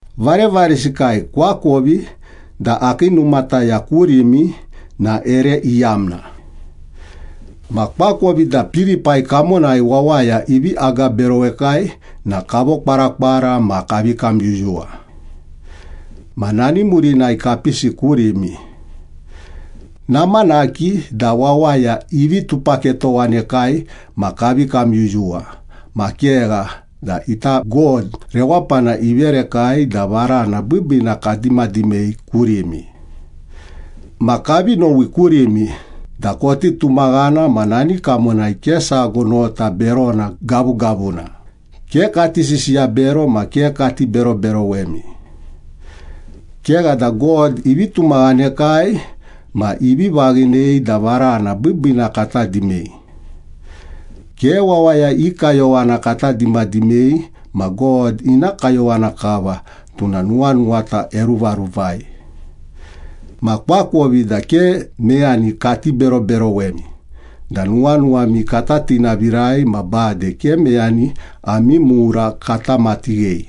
Varevaresikai, koakovi da akii numataya kurimi na ere iyamna. Ma koakovi da Pilipai kamonai wawaya ivi agaberowekai na kavokwarakwara ma kavi kamyuyuwa. Ma nani murinai kapisi kurimi. Namanaki da wawaya ivi tupaketowanekai ma kavi kamyuyuwa, ma kegha da ita God rewapana iverekai da varana biibiina kadimadimei kurimi. Ma kavi nowi kurimi da koti tumaghana ma nani kamonai ke sago nota berona gavugavuna, ke kati sisiya bero ma ke kati beroberowemi. Kegha da God ivi tumaghanekai ma ivi vaghinei da varana biibiina kata dimei. Ke wawaya i kayowana kata dimadimei ma God ina kayowana kava, tuna nuwanuwata eruvaruvai. Ma koakovi da ke meyani kati beroberowemi da nuwanuwami kata tinavirai ma bade ke meyani ami mura kata matighei.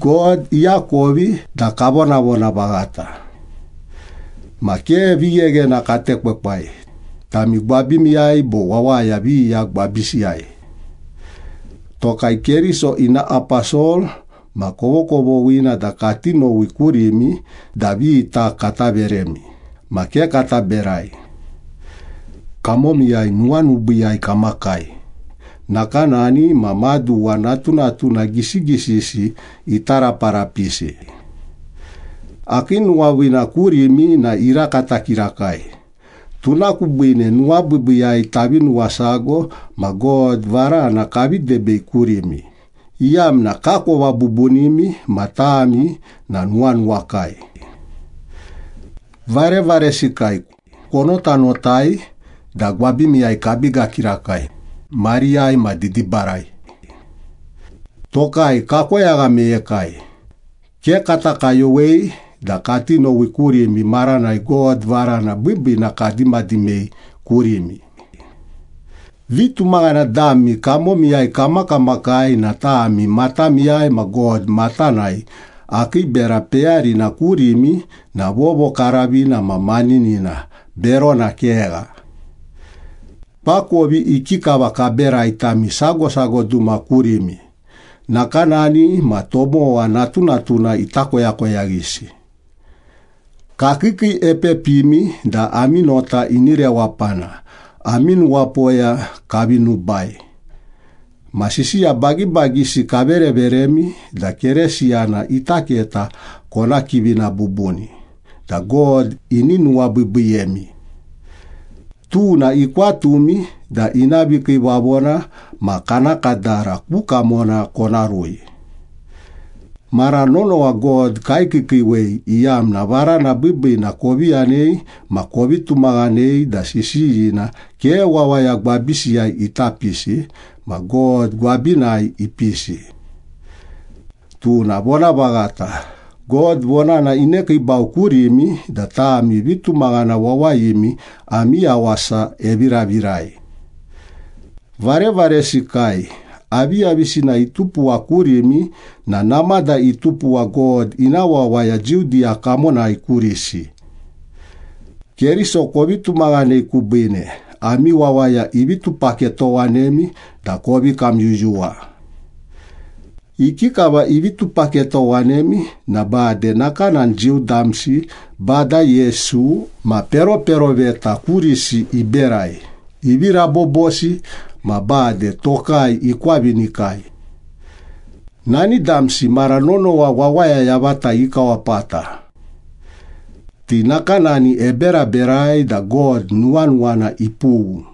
God iakovi da kavonavona vaghata. Ma ke vigheghena katekwekwai, tami gwabimiyai bo wawaya viya gwabisiyai. Tokai Keriso ina aposol ma kovokovoghina da kati nowi kurimi da vita kata veremi, ma ke kata berai. Kamomiyai nuwanubiiyai kamakai, nakanani ma maduwa natunatuna gisigisisi ita raparapisi. Akii nuwaviina kurimi na irakata kirakai, tuna kubiine nuwabiibiiyai tavi nuwasago ma God varana kavi debei kurimi, iyamna kakova bubunimi ma tami na nuwanuwakai. Varevaresikai, konotanotai da gwabimiyai kabiga kirakai, mariyai ma didibarai. Tokai kakoyagha meyekai, ke kata kayowei da kati nowi kurimi maranai God varana biibiina kadimadimei kurimi. Vitumaghana dami kamomiyai kamakamakai na tami matamiyai ma God matanai akii bera peyarina kurimi na vovokaravina ma maninina, berona kegha. Koakovi ikikava kaberai tami sago sago duma kurimi, nakanani ma tomowa natunatuna ita koyakoyaghisi. Kakiikiiepepimi da ami nota ini rewapana, ami nuwapoya kavi nubai, ma sisiya bagibagisi kavereveremi da Keresiyana ita keta kona kivina bubuni da God ini nuwabiibiiyemi. Tuna ikwatumi da ina vikiivavona ma kana kadara ku kamona kona rui. Mara nonowa God kaikiikiiwei iyamna varana biibiina kovi yanei ma kovi tumaghanei da sisiyina ke wawaya gwabisiyai ita pisi, ma God gwabinai ipisi. Tuna vonavaghata, God vonana inekiibau kurimi da tami vitumaghana wawayimi ami yawasa eviravirai. Varevaresikai, aviyavisina itupuwa kurimi na namada itupuwa God ina wawaya Judiya kamonai kurisi. Keriso kovi tumaghanei kubiine, ami wawaya ivi tupaketowanemi da kovi kamyuyuwa. Ikikava ivi tupaketowanemi na bade nakanani Jiu damsi Bada Yesu ma peroperoveta kurisi iberai, ivi rabobosi ma bade tokai ikwavinikai. Nani damsi mara nonowa wawaya yavata ikawapata. Ti nakanani eberaberai da God nuwanuwana ipughu.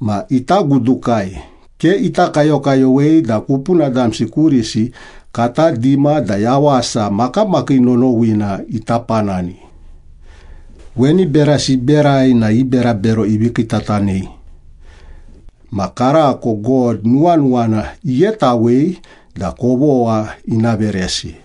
Ma ita gudukai, ke ita kayokayowei da kupuna damsi kurisi kata dima da yawasa makamakii nonowina ita panani. Weni berasi iberai na i berabero ivi kiitatanei. Ma karako God nuwanuwana ighetawei da kovogha ina veresi.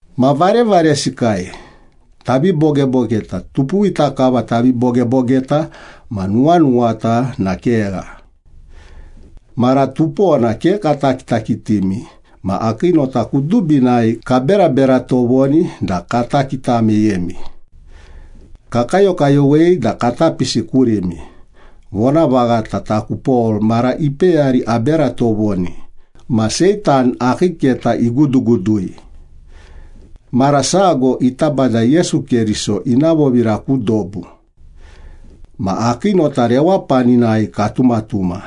Ma varevaresikai, tavi bogebogeta (tupuwita kava tavi bogebogeta ma nuwanuwata na kegha). Mara tupona ke kata kitakitimi ma akii nota kudubinai kaberabera tovoni da kata kita meyemi. Kakayokayowei da kata pisi kurimi, vonavaghata taku Pol mara ipeyari abera tovoni, ma Seitan akii keta igudugudui. Mara sago ita Bada Yesu Keriso ina vovira ku dobu. Ma akii nota rewapaninai katumatuma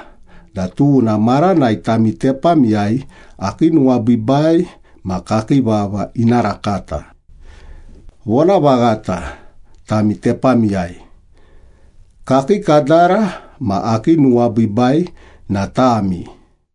da tuna maranai tami tepamiyai akii nuwabiibai ma kakii vava ina rakata. Vonavaghata, tami tepamiyai. Kakii kadara ma akii nuwabiibai na tami.